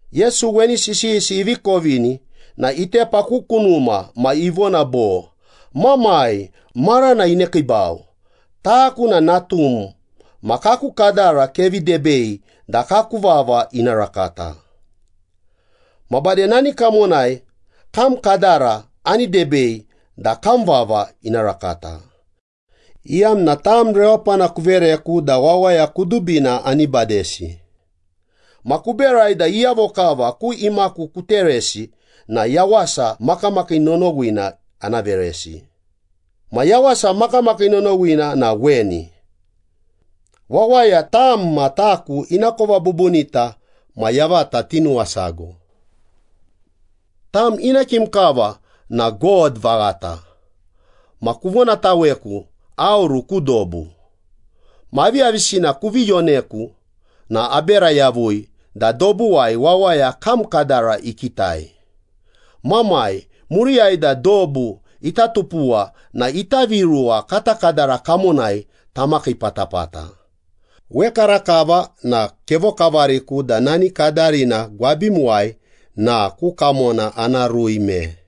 Yesu weni sisiyisi ivi kovini na itepa ku kunuma ma ivona bo, “Mamai, marana inekiibau. Taku na natum ma kaku kadara kevi debei da kaku vava ina rakata. Ma bade nani kamonai kam kadara ani debei da kam vava ina rakata, iyamna tam rewapana kuvereku da wawaya kudubina ani badesi. Ma kuberai da iyavo kava ku imaku kuteresi na yawasa makamakii nonowina ana veresi. Ma yawasa makamakii nonowina na weni. Wawaya tam ma taku inakova bubunita ma yavata tinuwasago. Tam ina kim kava na God vaghata ma kuvonataweku aoru ku dobu. Ma aviyavisina kuvi yoneku na abera yavui da dobuwai wawaya kam kadara ikitai. Mamai, muriyai da dobu ita tupuwa na ita viruwa kata kadara kamonai tamakai patapata. Wekarakava na kevokavariku da nani kadarina gwabimuwai na ku kamona ana rui me.”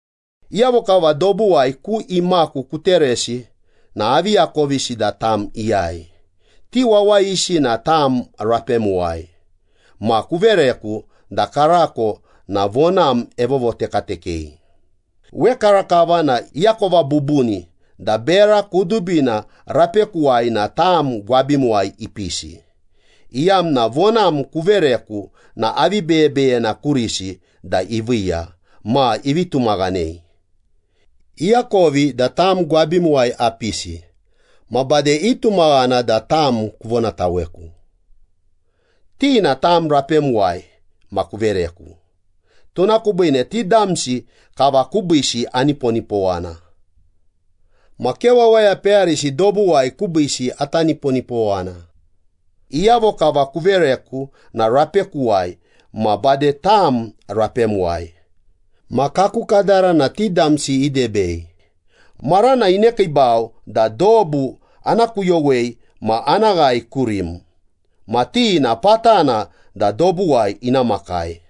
“Iyavo kava dobuwai ku imaku kuteresi na avi akovisi da tam iyai. Ti wawayisi na tam rapemuwai ma kuvereku da karako na vonam evovotekatekei. Wekarakava na iakova bubuni da bera kudubina rapekuwai na tam gwabimuwai ipisi, iyamna vonam kuvereku na avi beyebeyena kurisi da iviiya ma ivi tumaghanei. Iakovi da tam gwabimuwai apisi, ma bade itumaghana da tam kuvonataweku.” “Ti na tam rapemuwai ma kuvereku. Tuna kubiine ti damsi kava kubiisi aniponipowana. Ma ke wawaya peyarisi dobuwai kubiisi ata niponipowana. Iyavo kava kuvereku na rapekuwai ma bade tam rapemuwai. Ma kaku kadara na ti damsi idebei. Marana inekiibau da dobu ana kuyowei ma ana ghae kurim. Ma ti na patana da dobuwai ina makai.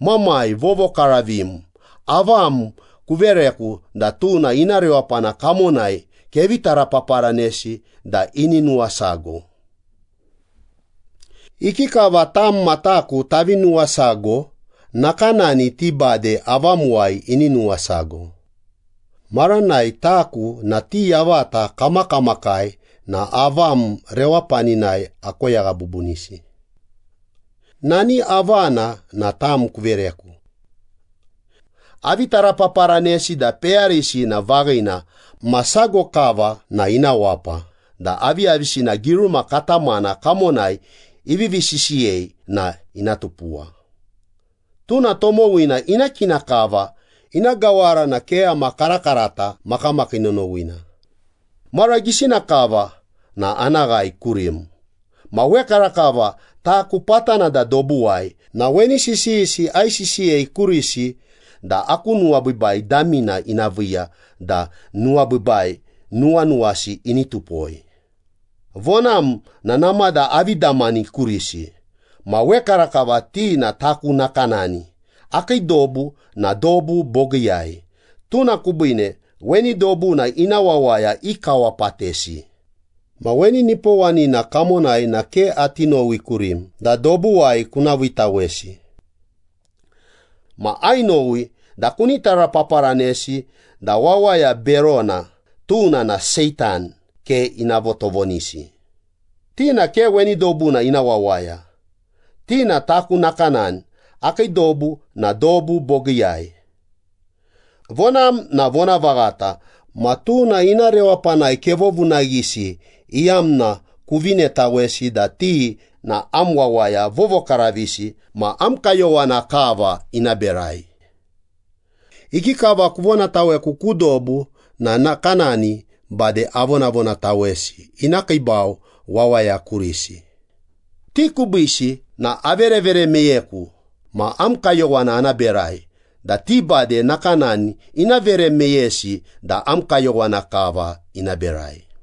Mamai Vovokaravim, avam kuvereku na tuna ina rewapana kamonai kevi tarapaparanesi da ini nuwasago. Ikikava tam ma taku tavi nuwasago, nakanani ti bade avamuwai ini nuwasago. Maranai taku na ti yavata kamakamakai na avam rewapaninai akoyagha bubunisi. Nani avana na tam kuvereku. Avi tarapaparanesi da peyarisi na vaghina ma sago kava na ina wapa da aviyavisina giruma katamana kamonai ivivi sisiyei na ina tupuwa. Tuna tomowina ina kina kava ina gawara na keyama karakarata makamakii nonowina. Mara gisina kava na ana ghae kurim. Ma wekarakava taku patana da dobuwai na weni sisiyisi aisisiyei kurisi da aku nuwabiibai damina ina viiya da nuwabiibai nuwanuwasi ini tupoi. Vonam na namada avi damani kurisi. Ma wekarakava ti na taku nakanani, akii dobu na dobu bogiiyai. Tuna kubine weni dobuna ina wawaya ikawapatesi. Ma weni nipowanina kamonai na ke ati nowi kurim da dobuwai kuna viitawesi. Ma ainowi da kuni tarapaparanesi da wawaya berona, tuna na Seitan, ke ina votovonisi. Ti na ke weni dobuna ina wawaya. Ti na taku nakanani, akii dobu na dobu bogiiyai. Vonam na vonavaghata ma tuna ina rewapanai kevovunaghisi iyamna kuvinetawesi da ti na am wawaya vovokaravisi ma am kayowana kava ina berai. Ikikava kuvonataweku ku dobu na nakanani bade avonavonatawesi ina kiibau wawaya kurisi. Ti kubiisi na averevere meyeku ma am kayowana ana berai da ti bade nakanani ina vere meyesi da am kayowana kava ina berai.”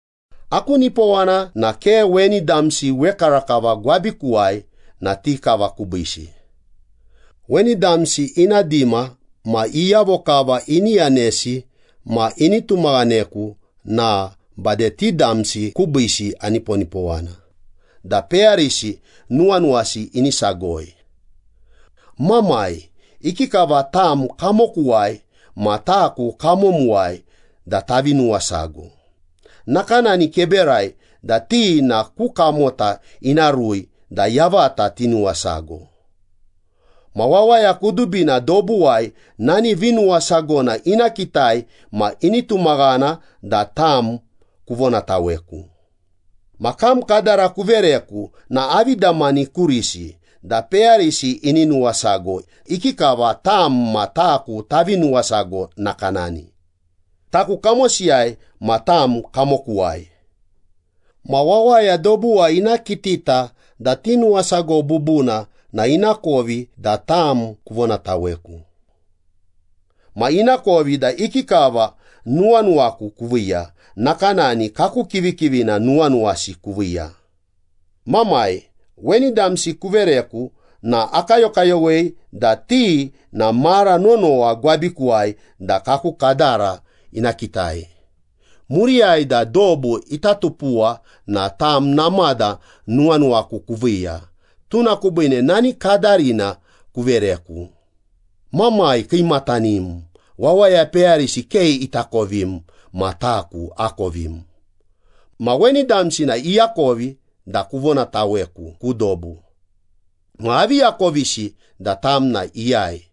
“Aku nipowana na ke weni damsi wekarakava gwabikuwai na ti kava kubiisi. Weni damsi ina dima ma iyavo kava ini yanesi ma ini tumaghaneku na bade ti damsi kubiisi aniponipowana da peyarisi nuwanuwasi ini sagoi. Mamai, ikikava tam kamokuwai, ma taku kamomuwai da tavi nuwasago, nakanani keberai da ti na ku kamota ina rui da yavata tinuwasago. Ma wawaya kudubina dobuwai nani vinuwasagona ina kitai ma ini tumaghana da tam kuvonataweku. Ma kam kadara kuvereku na avi damani kurisi, da peyarisi ini nuwasago, ikikava tam ma taku tavi nuwasago nakanani. Taku kamosiyai ma tam kamokuwai. Ma wawaya dobuwai ina kitita da tinuwasago bubuna na inakovi da tam kuvonataweku. Ma inakovi da ikikava nuwanuwaku kuviiya, nakanani kaku kivikivina nuwanuwasi kuviiya.” “Mamai, weni damsi kuvereku na akayokayowei da ti na mara nonowa gwabikuwai da kaku kadara ina kitai. Muriyai da dobu ita tupuwa na tam namada nuwanuwaku kuviiya, tuna kubiine nani kadarina kuvereku. Mamai Kiimatanim, wawaya peyarisi ke itakovim, ma taku akovim. Ma weni damsi na iakovi da kuvonataweku ku dobu. Ma avi akovisi da tam na iyai,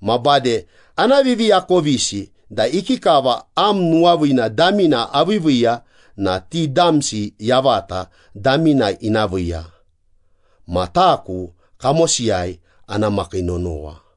ma bade ana viviakovisi da ikikava am nuwaviina damina aviiviiya na ti damsi yavata damina ina viiya, ma taku kamosiyai ana makii nonowa.”